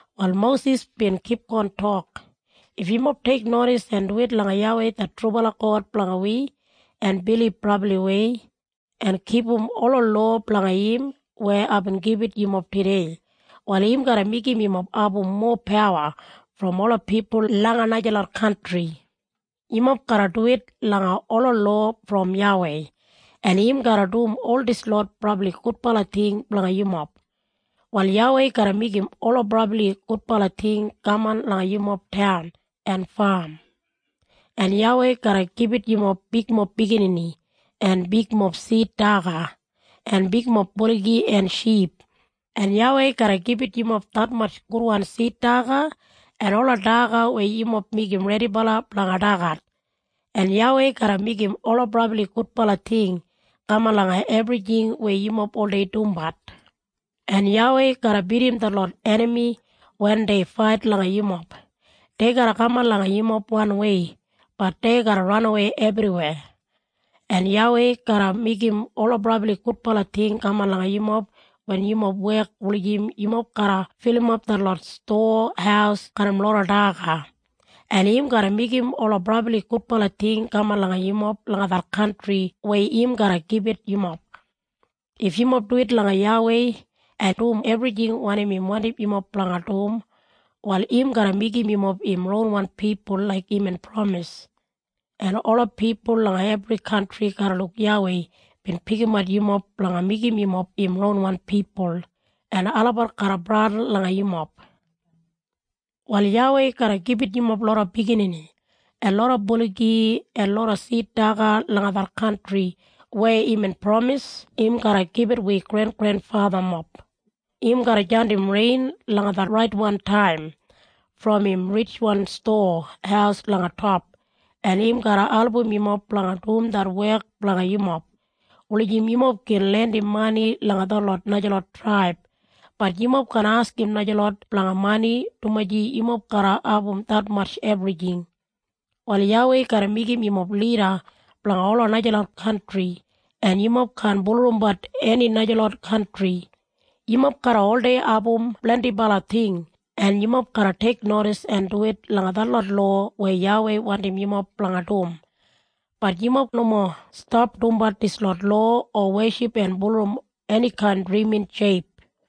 Wal Mosis bin kipgon tok, “If yumob teiknodis en duwit langa YAWEI det trubala God blanga wi, en bilib brabliwei, en kipum ola lowa blanga im weya aibin gibit yumob tudei, wal im garra meigim yumob abum mowa pawa brom ola pipul langa najalot kantri. Yumob garra duwit langa ola lowa brom YAWEI, en im garra dum ol dislot brabli gudbala ting blanga yumob. “Wal YAWEI garra meigim ola brabli gudbala ting kaman langa yumob taun en fam. “En YAWEI garra gibit yumob bigmob biginini, en bigmob sid daga, en bigmob buligi en ship. “En YAWEI garra gibit yumob detmatj gudwan sid daga en ola daga weya yumob meigim redibala blanga dagat. “En YAWEI garra meigim ola brabli gudbala ting kaman langa ebrijing weya yumob oldei dumbat. “En YAWEI garra bidim detlot enami wen dei fait langa yumob. Dei garra kaman langa yumob wanwei, bat dei garra ranawei ebriweya. “En YAWEI garra meigim ola brabli gudbala ting kaman langa yumob wen yumob wek wulijim yumob garra filimap detlot stowa haus garram loda daga. En im garra meigim ola brabli gudbala ting kaman langa yumob langa det kantri weya im garra gibit yumob. “If yumob duwit langa YAWEI, en dum ebrijing wanim im wandim yumob blanga dum, wal im garra meigim yumob im ronwan pipul laik imbin pramis. En ola pipul langa ebri kantri garra luk YAWEI bin pikimat yumob blanga meigim yumob im ronwan pipul, en olabat garra bradin langa yumob. Wal YAWEI garra gibit yumob loda biginini, en loda buligi, en loda sid daga langa det kantri weya imbin pramis im garra gibit wi grengrenfathamob. Im garra jandim rein langa det raitwan taim brom im ritjwan stowa haus langa top, en im garra album yumob blanga dum det wek blanga yumob, wulijim yumob gin lendim mani langa detlot najalot traib, bat yumob kaan askim najalot blanga mani dumaji yumob garra abum detmatj ebrijing. Wal YAWEI garra meigim yumob lida blanga ola najalot kantri, en yumob kaan bulurrumbat eni najalot kantri. Yumob garra oldei abum blendibala ting en yumob garra teiknodis en duwit langa detlot lowa weya YAWEI wandim yumob blanga dum. Bat yumob nomo stap dumbat dislot lowa o weship en bulurrum enikain drimin sheip.”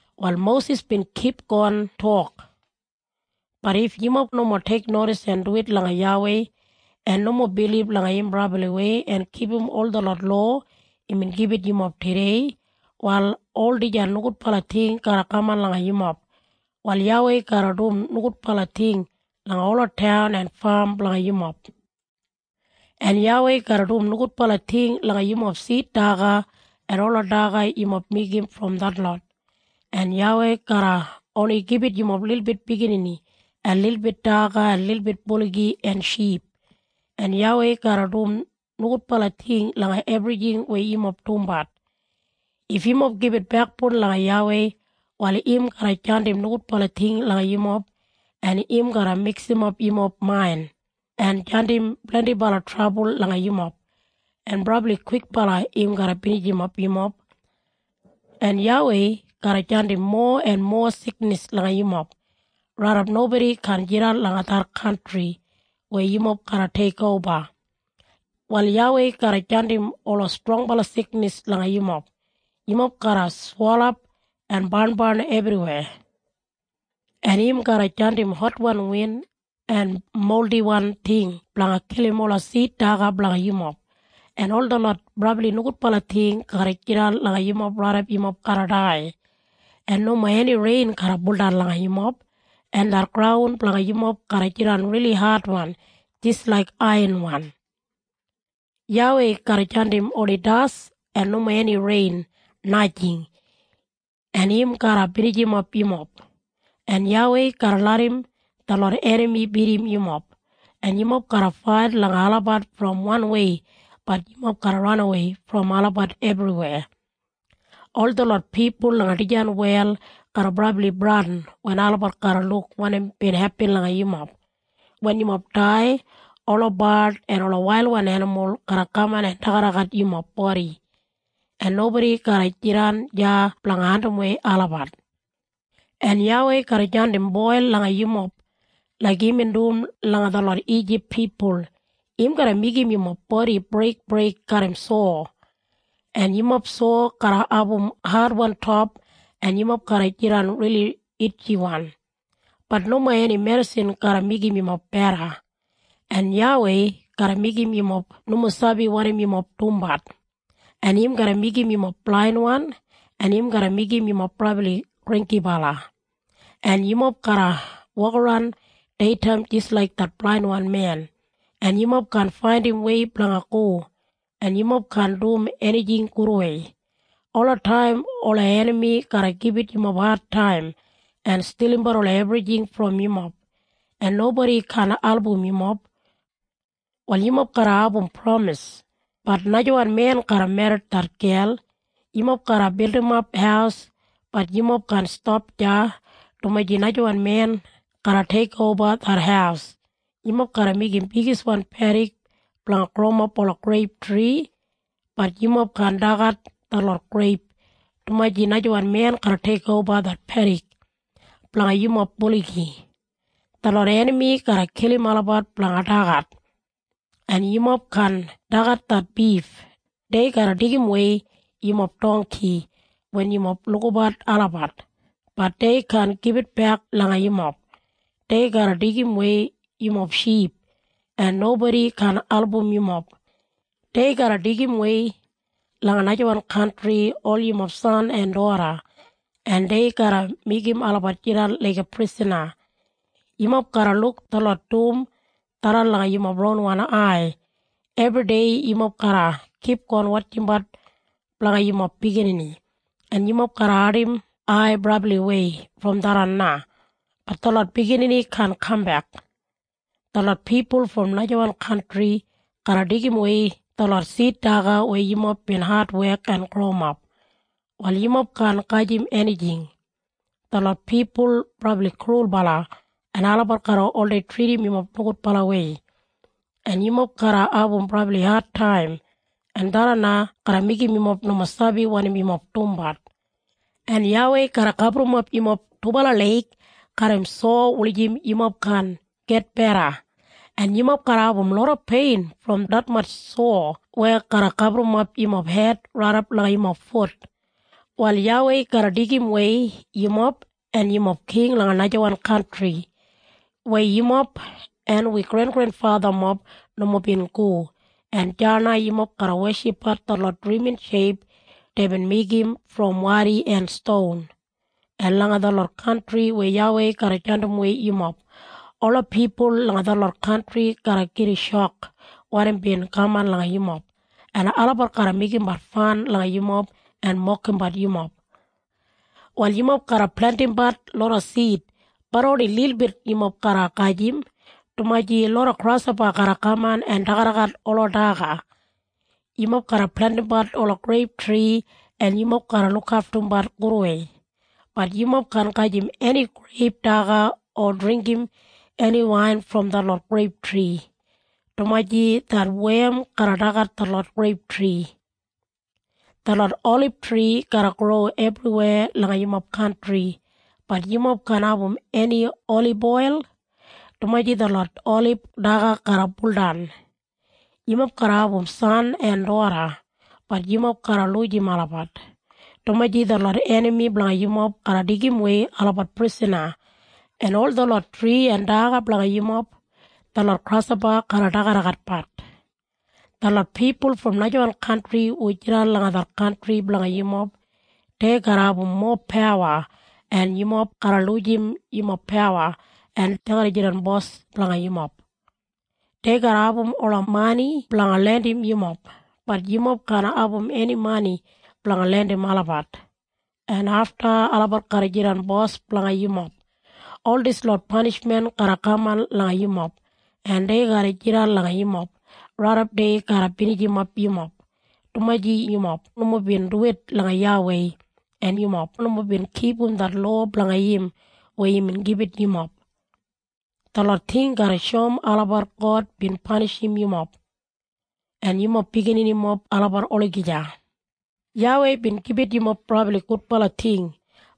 Wal Mosis bin kipgon tok, “Bat if yumob nomo teiknodis en duwit langa YAWEI, en nomo bilib langa im brabliwei en kipum ol detlot lowa imbin gibit yumob tudei, wal ol dijan nogudbala ting garra kaman langa yumob. “Wal YAWEI garra dum nogudbala ting langa ola taun en fam blanga yumob. “En YAWEI garra dum nogudbala ting langa yumob sid daga en ola daga yumob meigim brom detlot. “En YAWEI garra oni gibit yumob lilbit biginini en lilbit daga en lilbit buligi en ship. “En YAWEI garra dum nogudbala ting langa ebrijing weya yumob dumbat. “If yumob gibit bekboun langa YAWEI, wal im garra jandim nogudbala ting langa yumob en im garra miksimap yumob main, en jandim blendibala trabul langa yumob, en brabli kwikbala im garra binijimap yumob. En YAWEI garra jandim mowa en mowa siknis langa yumob, raidap nobodi kaan jidan langa det kantri weya yumob garra teikoba. Wal YAWEI garra jandim ola strongbala siknis langa yumob. Yumob garra swelap en barnbarn ebriweya. En im garra jandim hotwan win en moldiwan ting blanga kilim ola sid daga blanga yumob. En ol detlot brabli nogudbala ting garra jidan langa yumob raidap yumob garra dai. En nomo eni rein garra buldan langa yumob, en det graun blanga yumob garra jidan rili adwan jis laik aiyanwan. YAWEI garra jandim oni das en nomo eni rein, najing. En im garra binijimap yumob. “En YAWEI garra larram detlot enami bidim yumob. En yumob garra fait langa olabat brom wanwei bat yumob garra ranawei brom olabat ebriweya. Ol detlot pipul langa dijan wel garra brabli bradin wen olabat garra luk wanim bin hepin langa yumob. Wen yumob dai, ola bard en wailwan enimul garra kaman en dagadagat yumob bodi, en nobodi garra jidan deya blanga andimwei olabat. En YAWEI garra jandim boil langa yumob, laik imbin dum langa detlot Ijip pipul. Im garra meigim yumob bodi breikbreik garram sowa. En yumob sowa garra abum adwan top en yumob garra jidan rili itjiwan, bat nomo eni medisin garra meigim yumob beda. En YAWEI garra meigim yumob nomo sabi wanim yumob dumbat, en im garra meigim yumob blainwan en im garra meigim yumob brabli granggibala. En yumob garra wokaran deitaim jis laik det blainwan men, en yumob kaan faindim wei blanga go, en yumob kaan dum enijing gudwei. Olataim ola enami garra gibit yumob adtaim en stilimbat ola ebrijing brom yumob, en nobodi kaan album yumob. “Wal yumob garra abum pramis, bat najawan men garra merrit det gel. Yumob garra bildimap haus, bat yumob kaan stap deya dumaji najawan men garra teikoba det haus. Yumob garra meigim bigiswan pedik blanga growimap ola greip tri, bat yumob kaan dagat detlot greip dumaji najawan men garra teikoba det pedik. Blanga yumob buligi, detlot enami garra kilim olabat blanga dagat, en yumob kaan dagat det bif. Dei garra deigimwei yumob dongki wen yumob lukabat olabat, bat dei kaan gibitbek langa yumob. Dei garra deigimwei yumob ship, en nobodi kaan album yumob. Dei garra deigimwei langa najawan kantri ol yumob san en doda, en dei garra meigim olabat jidan laiga prisana. Yumob garra luk detlot dum tharran langa yumob ronwan ai. Ebridei yumob garra kipgon wotjimbat blanga yumob biginini, en yumob garra ardim ai brabliwei brom tharran na, bat detlot biginini kaan kambek. Detlot pipul brom najawan kantri garra deigimwei detlot sid daga weya yumob bin adwek en growimap. Wal yumob kaan gajim enijing. Detlot pipul brabli krulbala en olabat garra oldei tridim yumob nogudbalawei. En yumob garra abum brabli adtaim en tharran na garra meigim yumob nomo sabi wanim yumob dumbat. En YAWEI garra gaburrumap yumob dubala leig garram sowa wulijim yumob kaan gitbeda, en yumob garra abum loda pein brom detmatj sowa weya garra gaburrumap yumob hed raidap langa yumob fut. “Wal YAWEI garra deigimwei yumob en yumob king langa najawan kantri, weya yumob en wi grengrenfathamob nomo bin go, en deya na yumob garra weshipbat detlot drimin sheip deibin meigim brom wadi en ston. En langa detlot kantri weya YAWEI garra jandimwei yumob, ola pipul langa detlot kantri garra gida shok wanim bin kaman langa yumob, en olabat garra meigimbat fan langa yumob en mokimbat yumob. “Wal yumob garra plentimbat loda sid, bat oni lilbit yumob garra gajim, dumaji loda grashopa garra kaman en dagadagat ola daga. Yumob garra plentimbat ola greiptri en yumob garra lukaftumbat gudwei, bat yumob kaan gajim eni greip daga o dringgim eni wain brom detlot greiptri, dumaji det wem garra dagat detlot greiptri. Detlot olibtri garra gro ebriweya langa yumob kantri, bat yumob kaan abum eni oliboil, dumaji detlot olib daga garra buldan. Yumob garra abum san en doda, bat yumob garra lujim olabat, dumaji detlot enami blanga yumob garra deigimwei olabat prisana. En ol detlot tri en daga blanga yumob, detlot grashopa garra dagadagatbat. “Detlot pipul brom najawan kantri hu jidan langa det kantri blanga yumob, dei garra abum mowa pawa en yumob garra lujim yumob pawa en dei garra jidan bos blanga yumob. Dei garra abum ola mani blanga lendim yumob, bat yumob kaan abum eni mani blanga lendim olabat, en afta olabat garra jidan bos blanga yumob. “Ol dislot panishmen garra kaman langa yumob, en dei garra jidan langa yumob, raidap dei garra binijimap yumob, dumaji yumob nomo bin duwit langa YAWEI, en yumob nomo bin kipum det lowa blanga im weya imbin gibit yumob. Detlot ting garra shoum olabat God bin panishim yumob en yumob bigininimob olabat olagija. YAWEI bin gibit yumob brabli gudbala ting,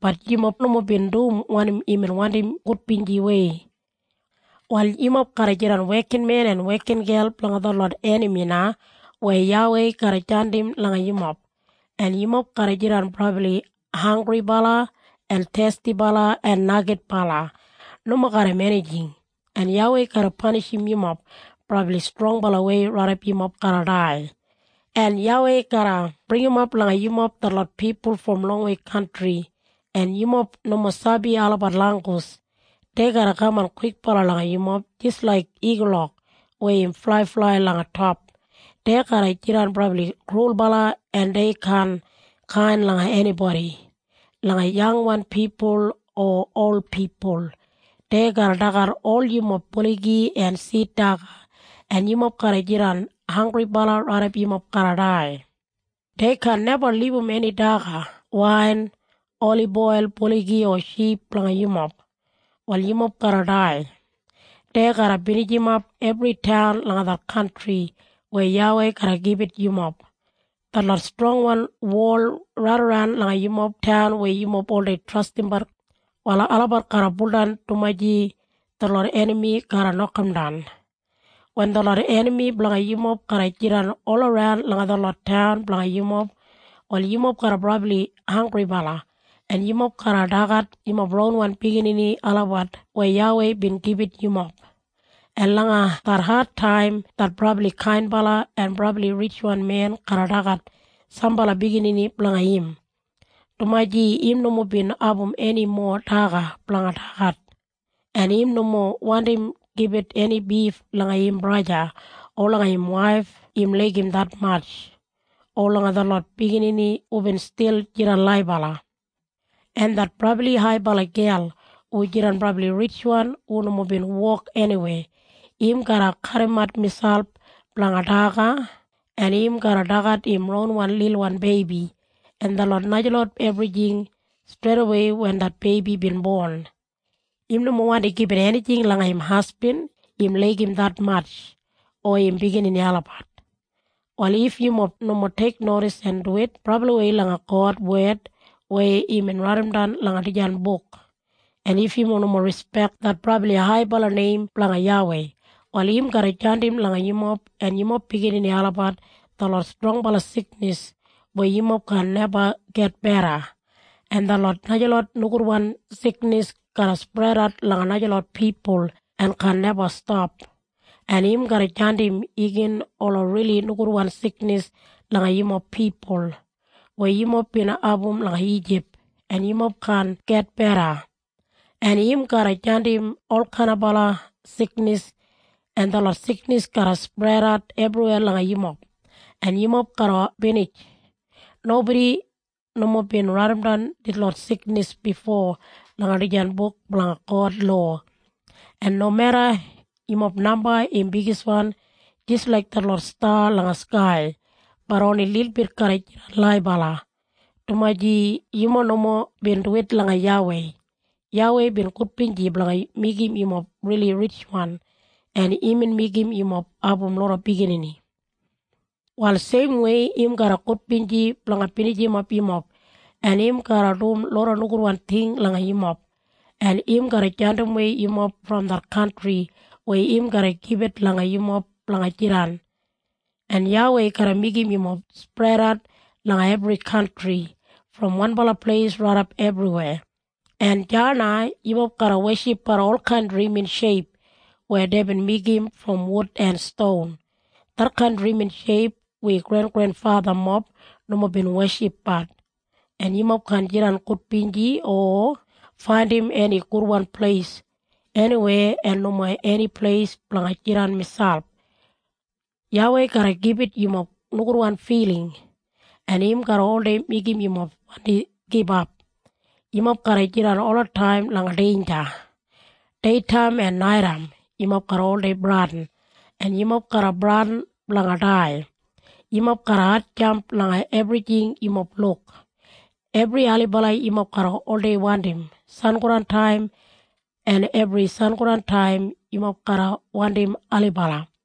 bat yumob nomo bin dum wanim imbin wandim gudbinjiwei. “Wal yumob garra jidan wekinmen en wekingel blanga detlot enami na weya YAWEI garra jandim langa yumob, en yumob garra jidan brabli hanggribala en thestibala en neigidbala nomo garram enijing, en YAWEI garra panishim yumob brabli strongbalawei raidap yumob garra dai. En YAWEI garra bringimap langa yumob detlot pipul brom longwei kantri, en yumob nomo sabi olabat langgus. Dei garra kaman kwikbala langa yumob jis laik igulok weya im flaiflai langa top. Dei garra jidan brabli krulbala en dei kaan kain langa enibodi, langa yangwan pipul o ol pipul. Dei garra dagat ol yumob buligi en sid daga en yumob garra jidan hanggribala raidap yumob garra dai. Dei kaan neba libum eni daga, wain, oliboil, buligi o ship blanga yumob. Wal yumob garra dai. Dei garra binijimap ebri taun langa det kantri weya YAWEI garra gibit yumob. Detlot strongwan wol raidaran langa yumob taun weya yumob oldei trastimbat, wal olabat garra buldan dumaji detlot enami garra nokamdan. “Wen detlot enami blanga yumob garra jidan olaran langa detlot taun blanga yumob, wal yumob garra brabli hanggribala, en yumob garra dagat yumob ronwan biginini olabat weya YAWEI bin gibit yumob. En langa det adtaim det brabli kainbala en brabli ritjwan men garra dagat sambala biginini blanga im, dumaji im nomo bin abum eni mowa daga blanga dagat. En im nomo wandi gibit eni bif langa im braja, o langa im waif im laigim detmatj, o langa detlot biginini hubin stil jidan laibala. En det brabli haibala gel hu jidan brabli ritjwan hu nomo bin wok eniweya, im garra kadimat miselp blanga daga en im garra dagat im ronwan lilwan beibi en detlot najalot ebrijing streidawei wen det beibi bin bon. Im nomo wandi gibit enijing langa im hasbin im laigim detmatj, o im biginini olabat. “Wal if yumob nomo teiknodis en duwit brabliwei langa God wed weya imbin raidimdan langa dijan buk, en if yumob nomo rispek det brabli haibala neim blanga YAWEI, wal im garra jandim langa yumob en yumob biginini olabat detlot strongbala siknis weya yumob kaan neba gitbeda, en detlot najalot nogudwan siknis garra spredat langa najalot pipul en kaan neba stap. En im garra jandim igin ola rili nogudwan siknis langa yumob pipul, weya yumob bin abum langa Ijip, en yumob kaan gitbeda. En im garra jandim olkainaba siknis en detlot siknis garra spredat ebriweya langa yumob, en yumob garra binij. Nobodi nomo bin raidimdan detlot siknis bifo langa dijan buk blanga God lowa. En nomeda yumob namba im bigiswan jis laik detlot sta langa skai, bat oni lilbit garra jidan laibala, dumaji yumob nomo bin duwit langa YAWEI. YAWEI bin gudbinji blanga meigim yumob rili ritjwan en imbin meigim yumob abum loda biginini. Wal seimwei im garra gudbinji blanga binijimap yumob en im garra dum loda nogudwan ting langa yumob, en im garra jandimwei yumob brom det kantri weya im garra gibit langa yumob blanga jidan. “En YAWEI garra meigim yumob spredat langa ebri kantri, brom wanbala pleis raidap ebriweya, en deya na yumob garra weshipbat olkain drimin sheip weya deibin meigim brom wud en ston. Detkain drimin sheip wi grengrenfathamob nomo bin weshipbat. En yumob kaan jidan gudbinji o faindim eni gudwan pleis eniweya en nomo eni pleis blanga jidan miselp. YAWEI garra gibit yumob nogudwan filing, en im garra oldei meigim yumob wandi gibap. Yumob garra jidan olataim langa deinja. Deitaim en naitaim yumob garra oldei bradin, en yumob garra bradin blanga dai. Yumob garra hatjamp langa ebrijing yumob luk. Ebri ailibala yumob garra oldei wandim sangodantaim, en ebri sangodantaim yumob garra wandim ailibala.